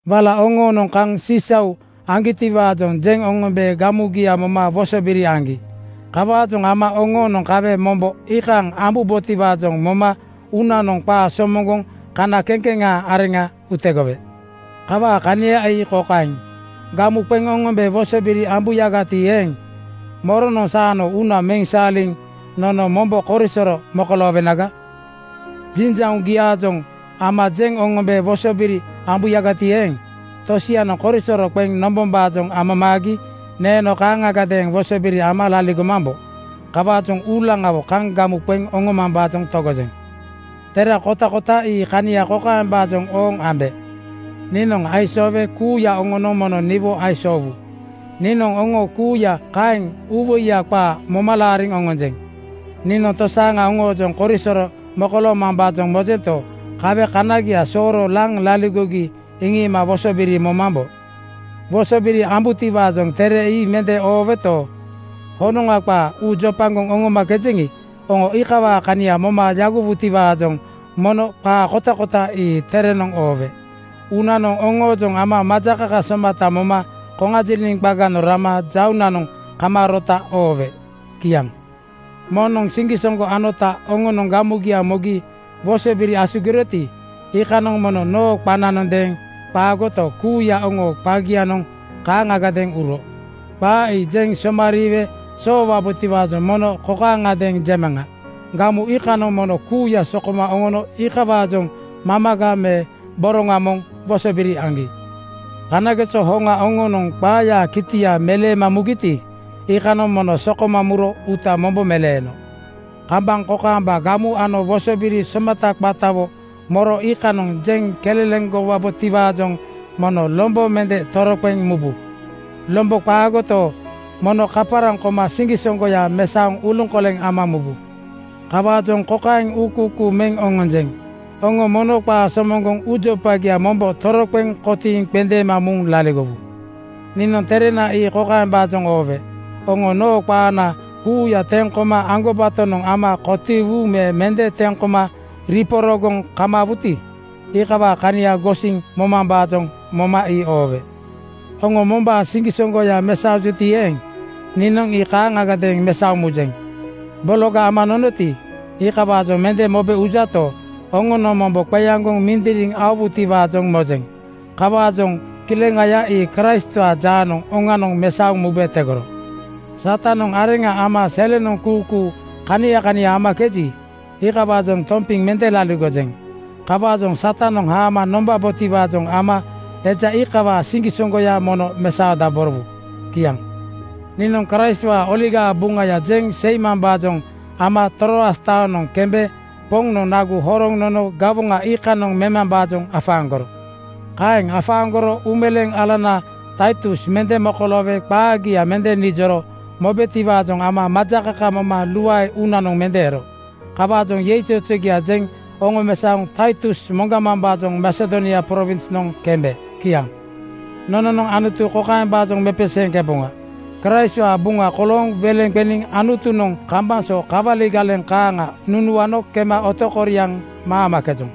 Wala oŋoonoŋ kaŋ sisau aŋgitiwaajoŋ jeŋ oŋombe gamugia moma wosobiri aŋgi. Kawaajoŋ ama oŋoonoŋ kawe mombo iikaaŋ ambubotiwaajoŋ moma uunanoŋ qaa somoŋgoŋ kana kekeŋaa arena utegowe. Kawaa kania ii kokaeŋ: Gamu qeŋ oŋombe wosobiri ambuyagati eeŋ, moronoŋ saanoŋ uuna meŋ saaliŋ nono mombo korisoro mokoloowenaga? Jinjauŋgiaajoŋ ama jeŋ oŋombe wosobiri ambuyagati eeŋ, tosianoŋ korisoro qeŋ nombombaajoŋ amamaagi neeno kaaŋagadeeŋ wosobiri ama laligomambo. Kawaajoŋ uulaŋawo kaŋ gamu qeŋ oŋomambaajoŋ togojeŋ. Tere kotakota ii kania kokaembaajoŋ ooŋ ambe: Niinoŋ aisoowe kuuya oŋonoŋ mono niwo aisoowu. Niinoŋ oŋo kuuya kaeŋ uuwoiya qaa moma laariŋ oŋonjeŋ. Niinoŋ tosaaŋa oŋoojoŋ korisoro mokoloomambaajoŋ mojento, kawe kanagia sooro laŋ laligogi iŋiima wosobiri momambo. Wosobiri ambutiwaajoŋ tere ii mende ooweto, honoŋa qaa uu jopagoŋ oŋomakejeŋi, oŋo iikawaa kania moma yagowutiwaajoŋ mono qaa kotakota ii terenoŋ oowe. Uunanoŋ oŋoojoŋ ama majakaka somata moma koŋajiliŋ qaganoŋ rama jauŋnanoŋ kamaarota oowe. Kiaŋ. Moŋnoŋ siŋgisoŋgo anota oŋonoŋ gamugia mogi wosobiri asugiroti, iikanoŋ mono noo qananondeeŋ qaagoto, kuuya oŋoo qagianoŋ kaaŋagadeeŋ uro. Qaa ii jeŋ somariiwe soowabotiwaajoŋ mono kokaaŋadeeŋ jemaŋa: Gamu iikanoŋ mono kuuya sokoma oŋono iikawaajoŋ mamaga me boroŋa moŋ wosobiri aŋgi. Kanageso hoŋa oŋonoŋ qaayaa kitia meleema mugiti, iikanoŋ mono sokoma muro uuta mombo meleeno. Kambaŋ kokaamba gamu ano wosobiri somata qatawo moro iikanoŋ jeŋ keleleŋgowabotiwaajoŋ mono lombo mende toroqeŋ mubu. Lombo qaagoto, mono kaparaŋ koma siŋgisoŋgoya mesaoŋ uluŋkoleŋ ama mubu. Kawaajoŋ kokaeŋ uukuukuu meŋ oŋonjeŋ: Oŋo mono qaa somoŋgoŋ uujopagia mombo toroqeŋ kotiiŋ qendeema muŋ laligowu. Niinoŋ terena ii kokaembaajoŋ oowe: Oŋo noo qaana kuuya teŋ koma aŋgobatonoŋ nama kotiiwu me mende teŋ koma riporogoŋ kamaawuti, iikawaa kania gosiŋ momambaajoŋ moma ii oowe. Oŋo mombaa siŋgisoŋgoya mesaojuti eeŋ, niinoŋ ii kaaŋagadeeŋ mesaoŋ mujeŋ. Bologa ama nonoti, iikawaajoŋ mende mobe ujato, oŋonoŋ mombo qeaŋgoŋ mindiriŋ aowutiwaajoŋ mojeŋ. Kawaajoŋ kileŋaya ii Kraistwaa jaanoŋ oŋanoŋ mesaoŋ mube tegoro. Satanoŋ areŋa ama selenoŋ kuukuu kania kania amakeji, iikawaajoŋ tompiŋ mende laligojeŋ. Kawaajoŋ Satanoŋ haamo ama nonombaboti-waajoŋ ama eja iikawaa siŋgisoŋgoya mono mesaodaborowu. Kiaŋ. Niinoŋ Kraistwaa Oligaa Buŋaya jeŋ seimambaajoŋ ama Troas taonoŋ kembe Poŋnoŋ nagu horoŋ nono gawoŋa iikanoŋ memambaajoŋ afaaŋgoro. Kaeŋ afaaŋgoroto, uumeleeŋ alana Taitus mende mokoloowe qaagia mende nijoro mobetiwaajoŋ ama majakaka moma luae uunanoŋ mende ero. Kawaajoŋ yeizozogia jeŋ oŋomesaoŋ Taitus moŋgamambaajoŋ Masedonia prowinsnoŋ kembe. Kiaŋ. Nononoŋ Anutu kokaembaajoŋ mepeseeŋkeboŋa: Kraistwaa buŋa kolooŋ weleŋa qeniŋ Anutunoŋ kambaŋ so kawali galeŋ kaaŋa nunuano kema otokoriaŋ maamakejoŋ.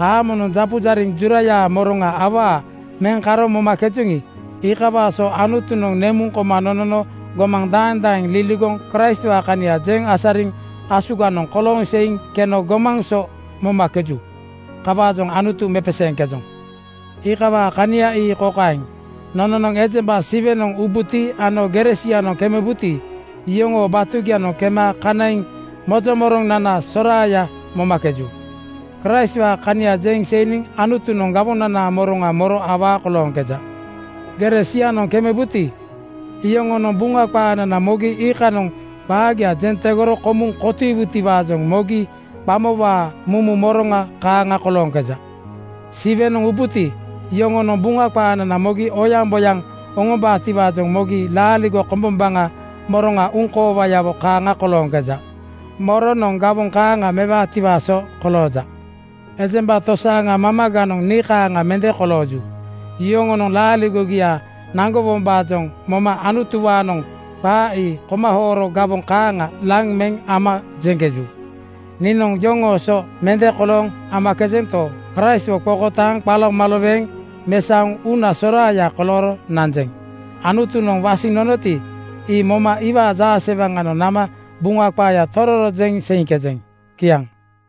Haamonoŋ japujariŋ jurayaa moroŋa awaa meŋ karo momakejoŋi, iikawaa so Anutunoŋ nemuŋ koma nonono gomaŋ daeŋ daeŋ liligoŋ Kraistwaa kania jeŋ asariniŋ asuganoŋ kolooŋ seiŋ keno gomaŋ so momakeju. Kawaajoŋ Anutu mepeseeŋkejoŋ. Iikawaa kania ii kokaeŋ: Nononoŋ ejemba Siwenoŋ ubuti ano gere sianoŋ kemebuti, iyoŋoo batugianoŋ kema kaniŋ mozo moroŋnana soraaya momakeju. Kraistwaa kania jeŋ seiniŋ Anutunoŋ gawonanaa moroŋa moro awaa kolooŋkeja. Gere sianoŋ kemebuti, iyoŋonoŋ Buŋa qaanana mogi iikanoŋ qaagia jeŋ tegoro komuŋ kotiiwutiwaajoŋ mogi qamowaa mumu moroŋa kaaŋa kolooŋkeja. Siwenoŋ ubuti, iyoŋonoŋ Buŋa qaanana mogi oyaŋboyaŋ oŋombaatiwaajoŋ mogi laaligo kombombaŋaa moroŋa uŋkoowayawo kaaŋa kolooŋkeja. Moronoŋ gawoŋ kaaŋa mewaatiwaa so kolooja? Ejemba tosaaŋa mamaganoŋ nii kaaŋa mende kolooju. Yoŋonoŋ laaligogia naŋgowombaajoŋ moma Anutuwaanoŋ qaa ii komahooro gawoŋ kaaŋa laŋ meŋ ama jeŋkeju. Niinoŋ iyoŋoo so mende kolooŋ amakejento, Kraistwo qokotaaŋ qalomaloweŋ mesaoŋ uuna soraaya kolooro nanjeŋ. Anutunoŋ wasiŋ nonoti, ii moma iwaa jaasewaŋanoŋ nama Buŋa qaaya tororo jeŋ seiŋkejeŋ. Kiaŋ.